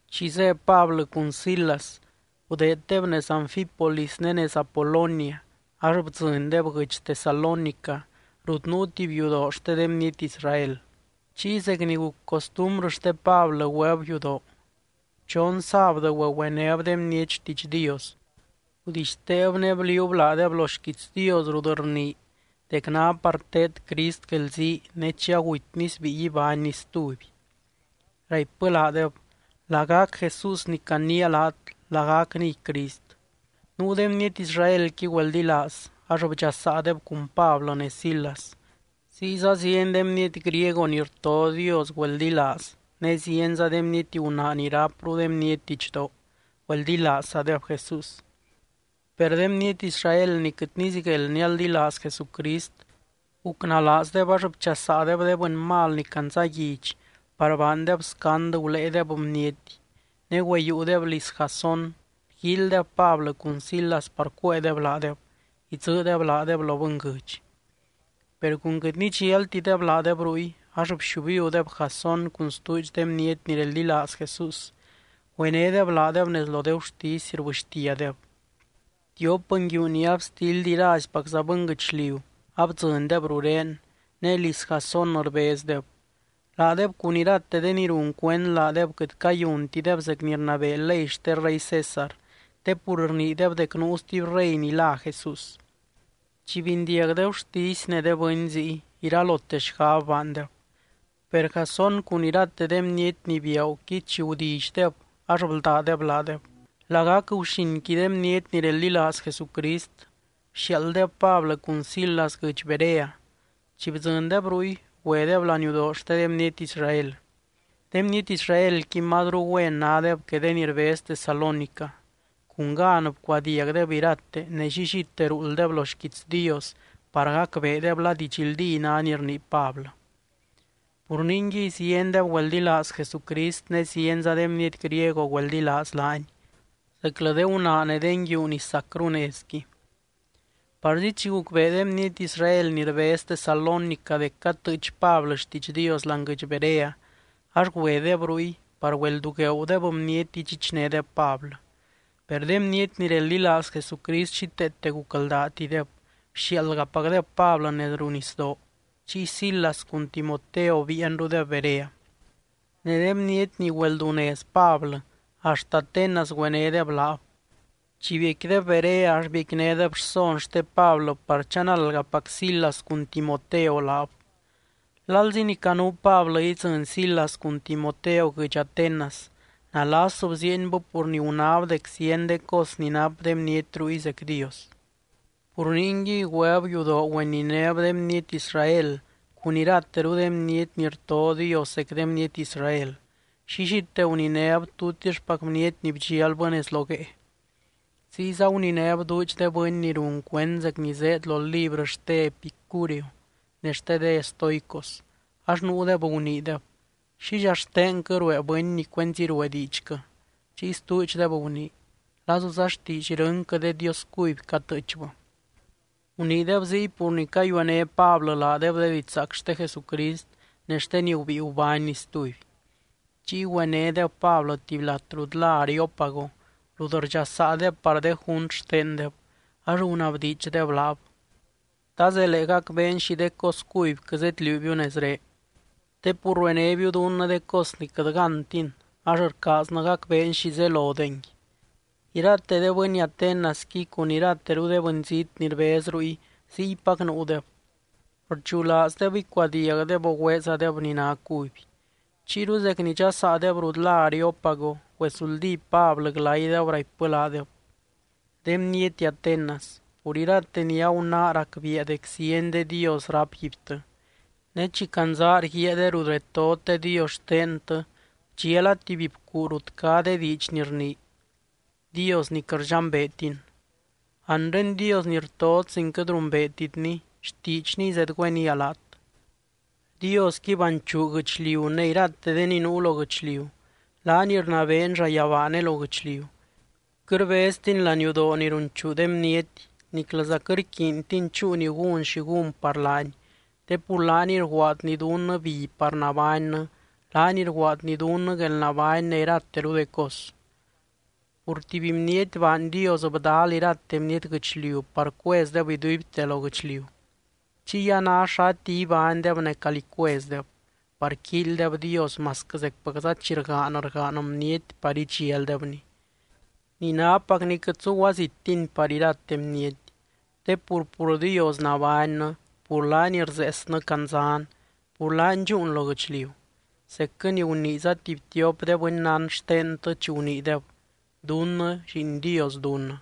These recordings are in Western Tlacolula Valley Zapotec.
Chi zé Pablɨ cun Silas, gudeeddeb nez Anfípolis ne nez Apolonia, ax bdzɨndeb guɨdx Tesalónica rut nuu tuby yudoo xte de bniety Israel. Chiy zec ni guc costumbrɨ xte Pablɨ, güeb yudoo. Chon sábdɨ güegüenéb de bniety xtiidx Dios. Gudixteeb ne bliuub laadeb lo xquiits Dios rut rnii dec ná par teed Crist guelzii, ne chi agutyny sbíi ibánny stuby. Raipbɨ laadeb: —Lagac Jesús ni caniia laat, lagacniy Crist. Nuu de bniety Israelqui güeldilaaz, ax bdxasaadeb cun Pablɨ ne Silas. Ziyza zieny de bniety griego ni rto Dios güeldilaaz, ne zienza de bniety gunaa ni rápru de bniety didxdoo, güeldilaazzadeb Jesús. Per de bniety Israel ni quɨt nizigueld nialdilaaz Jesucrist, gucnalaazdeb ax bchasaadeb de bɨny mal ni candzaguidx par baandeb scand guléedeb bniety. Ne güeyiiudeb liz Jasón, rguíilydeb Pablɨ cun Silas par cuéedeb laadeb, idzɨɨdeb laadeb lo bɨnguɨdx. Per cun quɨt nidxialtideb laadeb ruy, ax bxiubiudeb Jasón cun stuudx de bniety ni reldilaaz Jesús, güenédeb laadeb nez lo de gurtisy, rbɨxtiadeb: —Tiop nguiu ni abstildy iraizpacza bɨnguɨchliu, abdzɨndeb rurén, ne liz Jasón rbezdeb. Laadeb cun irate de ni run cuend laadeb, quɨt cayuntideb zec ni rnabee ley xte rey César te pur rniideb dec nuu stuby rey ni lá Jesús. Chi bindiag de gurtisy ne de bɨny ziy, iralote xgab baandeb. Per Jasón cun irateru de bniety ni biaaguqui chi gudillydeb, ax bldádeb laadeb. Lagac guxinqui de bniety ni reldilaaz Jesucrist, bxiaalddeb Pablɨ cun Silas guɨdx Berea. Chi bdzɨndeb ruy, güedeb laniudoo xte de bniety Israel. De bniety Israelqui mazru güen nádeb que de ni rbez Tesalónica. Cun gan bcuadiagdeb irate, ne llillite ruulddeb lo xquiits Dios par gacbeedeb la didxldí ná ni rnii Pablɨ. Pur ningui, ziendeb güeldilaaz Jesucrist ne zienza de bniety griego güeldilaaz laany, zeclɨ de gunaa ne de nguiu ni sacru nezqui. Parzi chi gucbee de bniety Israel ni rbez Tesalónica dec catɨɨch Pablɨ xtiidx Dios láani guɨdx Berea, ax güedeb ruy par güeldugueudeb bniety idxichnédeb Pablɨ. Per de bniety ni reldilaaz Jesucrist xíteete gucldaatideb, bxiaaldgapacdeb Pablɨ nez ruu nisdoo. Chiy Silas cun Timoteo biianrudeb Berea. Ne de bniety ni güeldunez Pablɨ, axt Atenas güenédeb laab. Chi biecquideb Berea ax biecquinédeb rson xte Pablɨ par chanaldgapac Silas cun Timoteo laab. Lalzi ni canuu Pablɨ idzɨny Silas cun Timoteo guɨdx Atenas, nalas bziienbɨ pur ni gunáb dec zieny de cos ni nap de bniety ruy zec Dios. Pur ningui, güeb yudoo güeninéb de bniety Israel cun irateru de bniety ni rto Dios zec de bniety Israel, llillite guninéb tutixpac bniety ni bdxialbɨ nez lo guee. Ziyza guninéb duudx de bɨny ni run cuend zec ni zéed lo librɨ xte Epicúreo ne xte de estoicos. Ax nuudeb guniideb: —¿Xidxa xtenquɨ ruee bɨny ni cuenzi ruee diidxquɨ? Chiy stuudxdeb gunii: —Lazuza xtiidx irɨnquɨ de dios cuby catɨɨchbɨ. Guniideb ziy pur ni cayuené Pablɨ laadeb de didxzaac xte Jesucrist ne xte ni gubíi gubánny stuby. Chiy güenédeb Pablɨ tuby lat rut lá Areópago, rut rdxasaadeb par de junt xtendeb. Ax gunabdiidxdeb laab: —¿Ta zelee gacbeen xi de cos cubyquɨ zedliuubiu nezré? Te pur ruenébiu dunnɨ de cos ni quɨt gántin, ax rcaaznɨ gacbeen xi zelodengui. (Irate de bɨny Atenasqui cun irateru de bɨnzít ni rbez ruy, ziypac nuudeb. Rdxulaazdeb icuadiagdeb, o güeezadeb ni ná cuby.) Chiyru zec ni dxasaadeb rut lá Areópago, güesuldí Pablɨ glaydeb, raipbɨ laadeb: —De bniety Atenas, pur irate ni agunáa racbiia dec zieny de dios rápguibtɨ. Ne chi candzaa rguíaa de rut retot de dios xtentɨ, bdxiala tuby bcuu rut cá de diidx ni rnii: DIOS NI QUƗT RDXAMBEETIN. Anre Dios ni rtot sin quɨt rumbeetitny, xtiidxniy zedgüénia laat. ’Diosqui banchuu guɨchliu ne irate de ni nuu lo guɨchliu, laany rnabeeny llayabaa ne lo guɨchliu. Quɨt rbeztiny laniudoo ni runchuu de bniety, niclɨza quɨt rquiintiny chúu ni gún xi gún par laany, te pur laaniy rguaadny dunnɨ bi par nabánnɨ, laany rguaadny dunnɨ guelnabány ne irateru de cos. ’Pur tuby bniety baany Dios bdal irate bniety guɨchliu par cuezdeb iduibte lo guɨchliu. Chiy a ná xati ibánydeb ne calí cuezdeb par quíilydeb Dios masquɨ zecpacza chi rgaan, rgaan bniety par idxialdebny. Ni nápacni quɨt zuguazittiny par irate bniety. Te pur, pur Dios nabánnɨ, pur laany rzeesnɨ candzan, pur laany dxúun lo guɨchliu. Zecquɨ ni guniiza tuby tiop de bɨnnán xtentɨ, chi guniideb: “Dunnɨ lliin Dios dunnɨ.”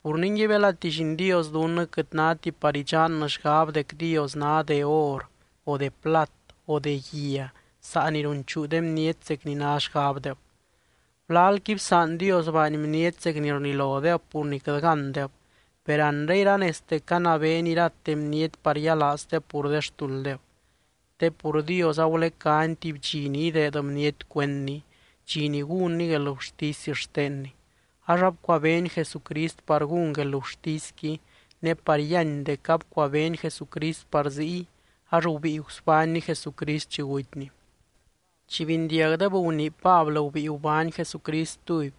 Pur ningui, belati lliin Dios dunnɨ, quɨt náti par idxannɨ xgab dec Dios ná de or, o de plat, o de guia saa ni runchuu de bniety zec ni ná xgabdeb. Gulalqui bsaan Dios baany bniety zec ni rlilodeb pur ni quɨt gándeb, per anre iranezte canabeeny irate bniety par yialaazdeb pur de xtulddeb. Te pur Dios agulecány tuby dxi ni ideed bniety cuendny, dxi ni gúnny guelgurtisy xtenny. Ax abcuabeeny Jesucrist par gún guelgurtisqui, ne par yíany dec abcuabeeny Jesucrist par ziy, ax gubíi gusbánny Jesucrist chi gutyny. Chi bindiagdeb gunii Pablɨ gubíi gubány Jesucrist stuby,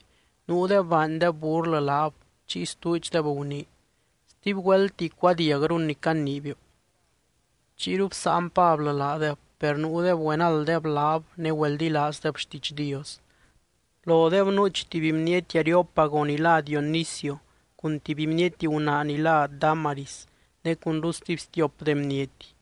nuudeb baandeb burlɨ laab chiy stuudxdeb gunii: —Stuby güeltti icuadiagrun ni caniibiu. Chiyru bsáan Pablɨ laadeb, per nuudeb güenalddeb laab ne güeldilaazdeb xtiidx Dios. Lodeb nuuch tuby bniety Areópago ni lá Dionisio cun tuby bniety gunaa ni lá Dámaris, ne cunru stuby stiop de bniety.